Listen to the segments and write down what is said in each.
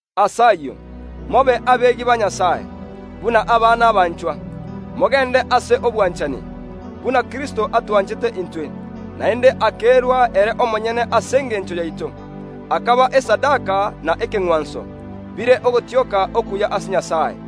Ase ayio, mobe abegi ba Nyasae, buna abana abanchwa; mogeende ase obwanchani, buna Kristo atwanchete intwe, naende akerua ere omonyene ase engencho yaito, akaba esadaka na ekeng’wanso, bire ogotioka okuya ase Nyasae.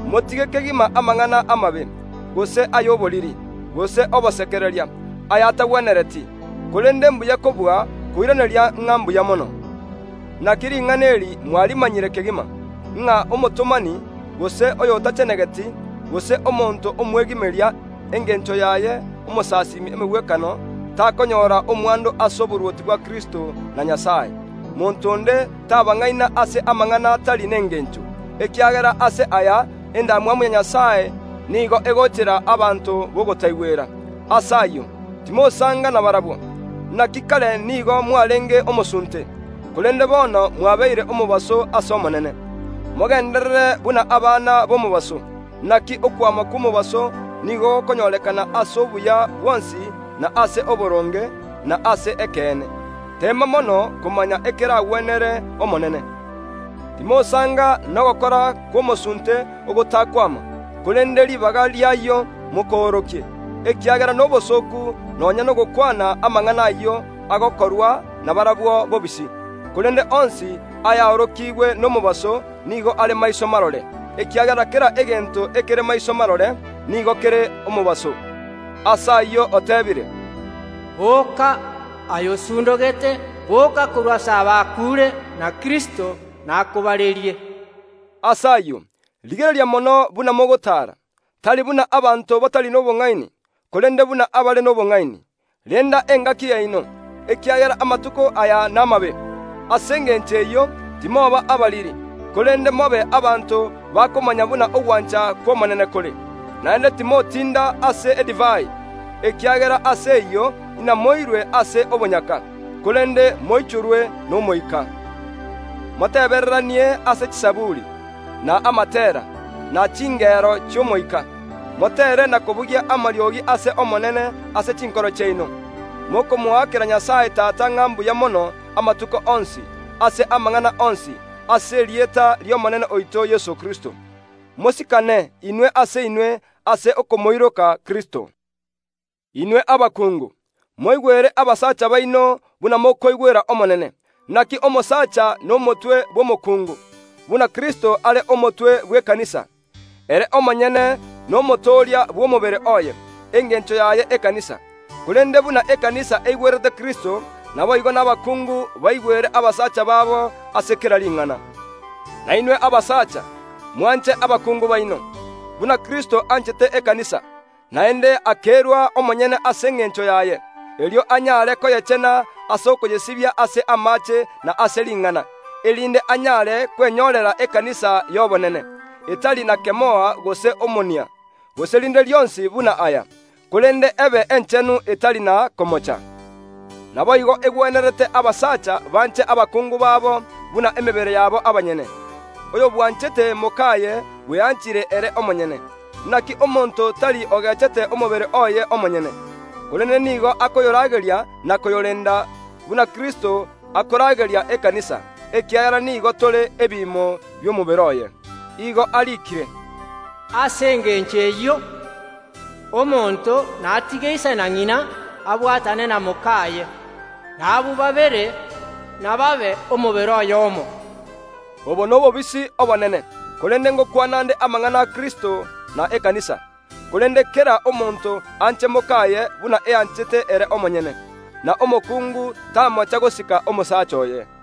Motige kegima amang’ana amabe, gose ay’oboriri, gose obosekereria, aya’atagwenereti; korende mbuya kobua koiraneria ng’a mbuya mono. Inaki ring’ana eri mwarimanyire kegima, ng’a omotomani, gose oyo otachenegeti, gose omonto omwegimeria (engencho yaye omosasiimi emegwekano) takonyora omwando ase oborwoti bwa Kristo na Nyasae. Monto onde tabang’aina ase amang’ana atari nengeencho, ekiagera ase aya endamwamu ya Nyasae nigo ekobaachera abanto b’ogotaigwera. Ase ayio, timosaanga nabarabwo. Inaki kare nigo mwareenge omosunte, korende bono mwabeire omobaso ase Omonene. Mogeenderere buna abana b’omobaso (inaki okwama kw’omobaso nigo gokonyorekana ase obuya bwonsi, na ase oboronge, na ase ekeene). Teema mono komanya ekeragwenere Omonene. Timosaanga n’ogokora kw’omosuunte ogotakwama, korende ribaga ri’ayio mokoorokie, ekiagera nobosooku nonya nogokwana amang’ana ayio agokorwa nabarabwo bobisi. Korende onsi ayaorokigwe nomobaso nigo are maiso marore, ekiagera kera egento ekere maiso marore nigo kere omobaso. Ase ayio oteebire, “Booka aye osundogete, booka korwa ase abakuure, na Kristo nakobarerie.” Ase ayio, rigereria mono buna mogotaara, tari buna abanto batari n’obong’aini, korende buna abare n’obong’aini. Renda engaki yaino, ekiagera amatuko aya namabe. Ase engencho eyio, timoba abariri, korende mobe abanto bakomanya buna ogwancha kw’Omonene kore. Naende timotinda ase edivai, ekiagera ase eyio inamoirwe ase obonyaka, korende moichorwe n’Omoika. Motebereranie ase chizaburi, na amateera, ne chingero chi’omoika; moteere na kobugia amariogi ase Omonene ase chinkoro chiaino, mokomoakera Nyasae Tata ng’a mbuya mono amatuko onsi, ase amang’ana onsi, ase erieta ri’Omonene oito Yeso Kristo. Mosikane inwe ase inwe ase okomoiroka Kristo. Inwe abakungu, moigwere abasacha baino buna mokoigwera Omonene. Inaki omosacha nomotwe bw’omokuungu, buna Kristo are omotwe bw’ekanisa; ere omonyene n’Omotooria bw’omobere oye, engencho yaye ekanisa. Korende buna ekanisa eigwerete Kristo, naboigo nabakungu baigwere abasacha babo ase kera ring’ana. Na inwe abasacha, mwanche abakungu baino, buna Kristo anchete ekanisa, naende akerua omonyene ase engencho y’ero, erio anyare koyechena ase okoyesibia ase amaache na ase ring’ana, erinde anyare kwenyorera ekanisa y’obonene, etari na kemoa gose omonia, gose rinde rionsi buna aya, korende ebe enchenu etari na kemoa. Naboigo egwenerete abasacha banche abakungu babo buna emebere yabo abanyene. Oyobwanchete mok’aye bweanchire ere omonyene. Inaki omonto taiyo ogeechete omobere oye omonyene, korende nigo akoyorageria na koyorenda, buna Kristo akorageria ekanisa, ekiagera nigo tore ebiimo bi’omobere oye. Nigo eriikire, “Ase engencho eyio, omonto natige ise na ng’ina abwatane na mok’aye, na abwo babere inababe omobere oyoomo.” Obo nobobisi obonene; korende ngokwana nde amang’ana a Kristo na ekanisa. Korende kera omonto anche mok’aye buna eanchete ere omonyene; na omokungu tamocha gosika omosacha oye.